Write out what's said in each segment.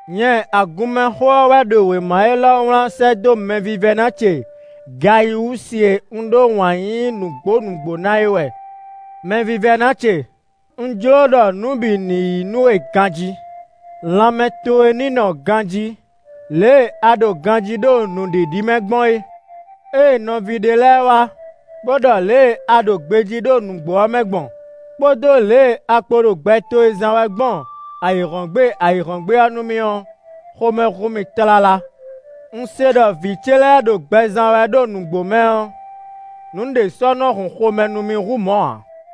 Nyɛ Agunmɛxó ɔ́ wɛ ɖo wěma élɔ́ wlán sɛ́ dó mɛvívɛ́ná ce Gayiwúsi e un ɖó wǎn yíyí nǔgbó nǔgbó ná é wɛ. Mɛvívɛ́ná ce, un jló ɖɔ nǔ bǐ ní yi nú we ganjí, lanmɛ towe ní nɔ ganjí lě e a ɖo ganjí ɖo nǔɖiɖi mɛ gbɔn é. Ée nɔví ɖé lɛ́ɛ wá bó ɖɔ lě e a ɖo gbejí ɖo nǔgbó ɔ́ mɛ gbɔn, kpódó lě e a kpo ɖo gbɛ towe zán wɛ gbɔn ayǐhɔ́ngbe ayǐhɔ́ngbe ɔ́ nú mì ɔ́, xomɛ hun mì tlala. Un se ɖɔ vǐ ce lɛ́ɛ ɖo gbɛ zán wɛ ɖo nǔgbó mɛ ɔ́, nǔɖé sɔ́ nɔ hun xomɛ nú mì hú mɔ̌ ǎ.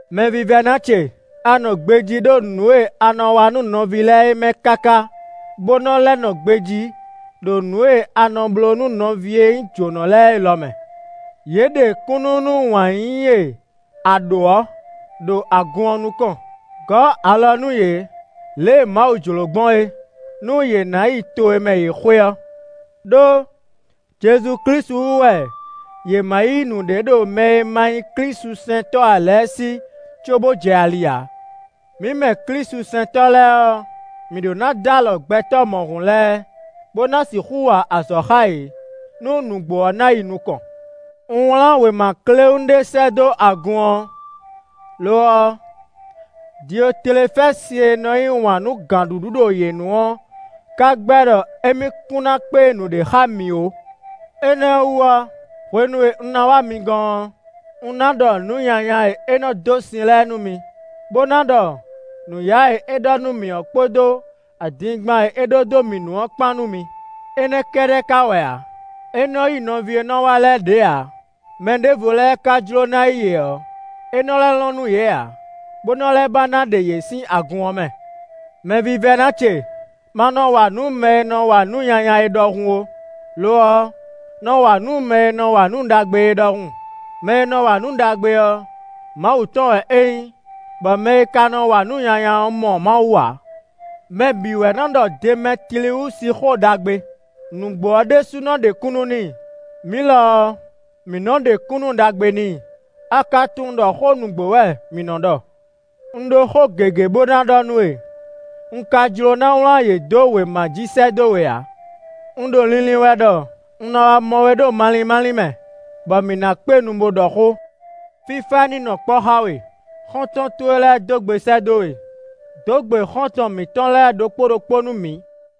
Mɛvívɛ́ná ce, a nɔ gbejí ɖo nǔ e a nɔ wa nú nɔví lɛ́ɛ é mɛ káká bó nɔ lɛ́ nɔ gbejí ɖo nǔ e a nɔ bló nú nɔví e nyí jǒnɔ lɛ́ɛ é lɔ mɛ. Yě ɖe kúnnu nú wǎn yíyí e a ɖǒ ɔ́ ɖo agun ɔ́ nukɔn; gɔ̌ alɔ nú yě lě e Mawu jló gbɔn é, nú yě ná yi to e mɛ yě xwe ɔ́. Đó Jezu Klísu wú wɛ yě ma yí nǔɖé ɖo mɛ e ma nyí klísusɛntɔ́ ǎ lɛ́ɛ sí cóbó jɛ ali ǎ. Mǐ mɛ klísusɛntɔ́ lɛ́ɛ ɔ́, mǐ ɖó ná d'alɔ gbɛtɔ́ mɔ̌hun lɛ́ɛ, bó ná sixú wa azɔ̌ xá yě, nú nǔgbó ɔ́ ná yi nukɔn. Un wlán wěma kléwún ɖé sɛ́ dó agun ɔ́; lo ɔ́, Diotlefɛ́si e nɔ yí wǎn nú gǎnɖuɖu ɖo yě nu ɔ́ ka gbɛ́ ɖɔ émí kún ná kpé nǔɖé xá mǐ ó. Énɛ́ ɔ́ wú ɔ́, hwenu e un ná wá mi gɔ́n ɔ́, un ná ɖɔ nǔ nyanya e é nɔ́ dó sin lɛ́ɛ nú mi, bó ná ɖɔ nǔyá e é ɖɔ nú mǐ ɔ́ kpódó adingban e é ɖó dó mǐ nu ɔ́ kpán nú mi; énɛ́ kɛ́ɖɛ́ ká wɛ ǎ; é nɔ́ yí nɔví e nɔ wá lɛ́ɛ ɖě ǎ; mɛ ɖěvo lɛ́ɛ ka jló ná yí yě ɔ́, é nɔ lɛ́ lɔn nú yě ǎ, bó nɔ lɛ́ ba ná ɖe yě sín agun ɔ́ mɛ. Mɛvívɛ́ná ce, ma nɔ wa nǔ mɛ e nɔ wa nǔ nyanya é ɖɔhun ó; lo ɔ́, nɔ wa nǔ mɛ e nɔ wa nǔ ɖagbe é ɖɔhun. Mɛ e nɔ wa nǔ ɖagbe ɔ́, Mawu tɔn wɛ é nyí, bɔ mɛ e ka nɔ wa nǔ nyanya ɔ́ mɔ Mawu ǎ. Mɛ bǐ wɛ nɔ ɖɔ Demɛtliwúsi xó ɖagbe; nǔgbó ɔ́ ɖésúnɔ ɖe kúnnu n'i; mǐ lɔ ɔ́, mǐ nɔ́ ɖe kúnnu ɖagbe n'i; a ka tunwun ɖɔ xó nǔgbó wɛ mǐ nɔ́ ɖɔ. Un ɖó xó gěgé bó ná ɖɔ nú we; un ka jló ná wlán yě dó wěma jí sɛ́ dó we ǎ. Un ɖo linlin wɛ ɖɔ un ná wá mɔ we ɖo malín málín mɛ, bɔ mǐ ná kpé nu bó ɖɔ xó. Fífá ní nɔ kpɔ́ xá we. Xɔ́ntɔn towe lɛ́ɛ dó gbe sɛ́ dó we. Dǒ gbe xɔ́ntɔn mǐtɔn lɛ́ɛ ɖokpó ɖokpó nú mǐ.